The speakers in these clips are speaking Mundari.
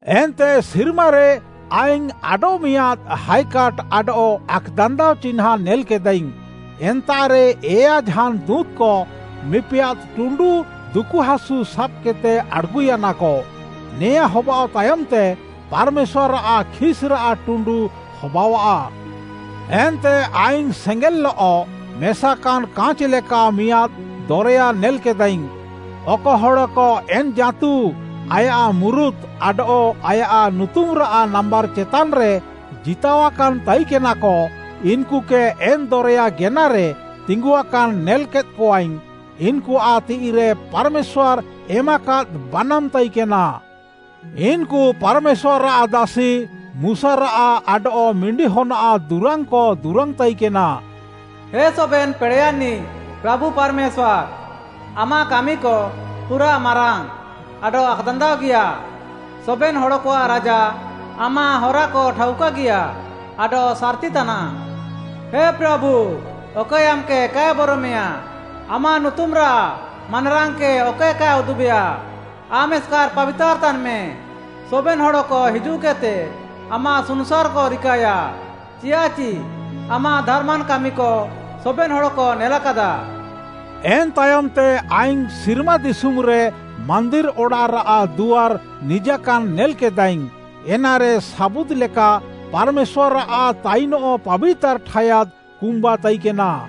ଏନ୍ତେ ସିର୍ମାରେ ଆଇଙ୍ଗ୍‌ ଆଡଃମିଆଁଦ୍‌ ହାଏକାଟ୍‌ ଆଡଃ ଆକ୍‌ଦାନ୍ଦାଅ ଚିହ୍ନାଁଁ ନେଲ୍‍କେଦାଇଙ୍ଗ୍‌। ଏନ୍ତାଃରେ ଏୟା ଝାନ୍‌ ଦୁଁତ୍‌କ ମିପିଆଦ୍‌ ଟୁଣ୍ଡୁ ଦୁକୁହାସୁ ସାବ୍‌କେଦ୍‌ତେ ଆଡ଼୍‌ଗୁୟାନାକ। ନେଆଁ ହବାଅଃ ତାୟମ୍‌ତେ, ପାର୍‌ମେଶ୍ୱାର୍‌ଆଃ ଖିସ୍‌ରାଃ ଟୁଣ୍ଡୁ ହବାଅଃଆ। ଏନ୍ତେ ଆଇଙ୍ଗ୍‌ ସେଙ୍ଗେଲ୍‍ଲଃ ମେସାକାନ୍‌ କାଁଚ୍‌ ଲେକା ମିଆଁଦ୍‌ ଦରେୟା ନେଲ୍‌କେଦାଇଙ୍ଗ୍‌। ଅକ ହଡ଼କ ଏନ୍‌ ଜାଁତୁ, ଆୟାଃ ମୁରୁତ୍‌ ଆଡଃ ଆୟାଃ ନୁତୁମ୍‌ରାଃ ନାମ୍ବାର୍‌ ଚେତାନ୍‌ରେ ଜିତାଅକାନ୍‌ ତାଇକେନାକ, ଇନ୍‌କୁକେ ଏନ୍‌ ଦରେୟା ଗେନାରେ ତିଙ୍ଗୁଆକାନ୍‌ ନେଲ୍‌କେଦ୍‌କଆଇଙ୍ଗ୍‌। ଇନ୍‌କୁଆଃ ତିଃଇରେ ପାର୍‌ମେଶ୍ୱାର୍‌ ଏମାକାଦ୍‌ ବାନାମ୍‌ ତାଇକେନା। ଇନ୍‌କୁ ପାର୍‌ମେଶ୍ୱାର୍‌ଆଃ ଦାସି ମୁଶାରାଃ ଆଡଃ ମିଣ୍ଡିହନ୍‌ଆଃ ଦୁରାଙ୍ଗ୍‌କ ଦୁରାଙ୍ଗ୍‌ତାଇକେନା। “ହେ ସବେନ୍‍ ପେଡ଼େୟାନ୍‌ନିଃ ପ୍ରାଭୁ ପାର୍‍ମେଶ୍ୱାର୍‌, ଆମାଃ କାମିକ ପୁରାଃ ମାରାଙ୍ଗ୍‌ ଆଡଃ ଆକ୍‌ଦାନ୍ଦାଅଗିୟା! ସବେନ୍‌ ହଡ଼କଆଃ ରାଜା, ଆମାଃ ହରାକ ଠାଉକାଗିୟା ଆଡଃ ସାର୍‌ତି ତାନାଃ! ହେ ପ୍ରାଭୁ, ଅକଏ ଆମ୍‌କେ କାଏ ବରମେୟାଁ? ଆମାଃ ନୁତୁମ୍‌ରାଃ ମାନାରାଙ୍ଗ୍‌କେ ଅକଏ କାଏ ଉଦୁବେୟା? ଆମ୍‌ ଏସ୍‍କାର୍‍ ପାବିତାର୍‌ ତାନ୍‌ମେ, ସବେନ୍‌ ହଡ଼କ ହିଜୁଃକେଦ୍‌ତେ ଆମାଃ ସୁନୁସାର୍‌କ ରିକାଏୟା। ଚିଆଃଚି ଆମାଃ ଧାର୍‌ମାନ୍‌ କାମିକ ସବେନ୍‌ ହଡ଼କ ନେଲାକାଦାକ।” ଏନ୍‌ ତାୟମ୍‌ତେ ଆଇଙ୍ଗ୍‌ ସିର୍ମା ଦିଶୁମ୍‌ରେ ମାନ୍ଦିର୍‌ ଅଡ଼ାଃରାଃ ଦୁଆର୍‌ ନିଜାକାନ୍‌ ନେଲ୍‌କେଦାଇଙ୍ଗ୍‌। ଏନାରେ ସାବୁଦ୍‌ ଲେକା ପାର୍‌ମେଶ୍ୱାର୍‌ଆଃ ତାଇନଃ ପାବିତାର୍‌ ଠାୟାଦ୍‌ କୁମ୍ବା ତାଇକେନା।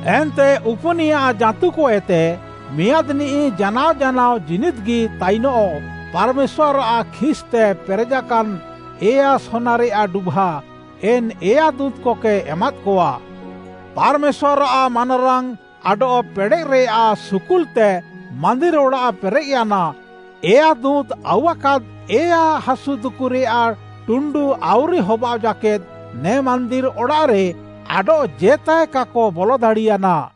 ଏନ୍ତେ ଉପୁନିୟା ଜାଁତୁକଏତେ ମିଆଁଦ୍‌ନିଃ ଜାନାଅ ଜାନାଅ ଜୀନିଦ୍‌ଗି ତାଇନଃ ପାର୍‌ମେଶ୍ୱାର୍‌ଆଃ ଖିସ୍‌ତେ ପେରେଜାକାନ୍‌, ଏୟା ସୋନାରେୟାଃ ଡୁଭା, ଏନ୍‌ ଏୟା ଦୁଁତ୍‌କକେ ଏମାଦ୍‌କଆ। ପାର୍‌ମେଶ୍ୱାର୍‌ଆଃ ମାନାରାଙ୍ଗ୍‌ ଆଡଃ ପେଡ଼େଃରେୟାଃ ସୁକୁଲ୍‌ତେ ମାନ୍ଦିର୍‍ ଅଡ଼ାଃ ପେରେଃୟାନା, ଏୟା ଦୁଁତ୍‌ ଆଉୱାକାଦ୍‌ ଏୟା ଦୁକୁହାସୁରେୟାଃ ଟୁଣ୍ଡୁ ଆଉରି ହବାଅଃ ଜାକେଦ୍‌, ନେ ମାନ୍ଦିର୍‌ ଅଡ଼ାଃରେ ଆଡଃଜେତାଏ କାକ ବଲଦାଡ଼ିୟାନା।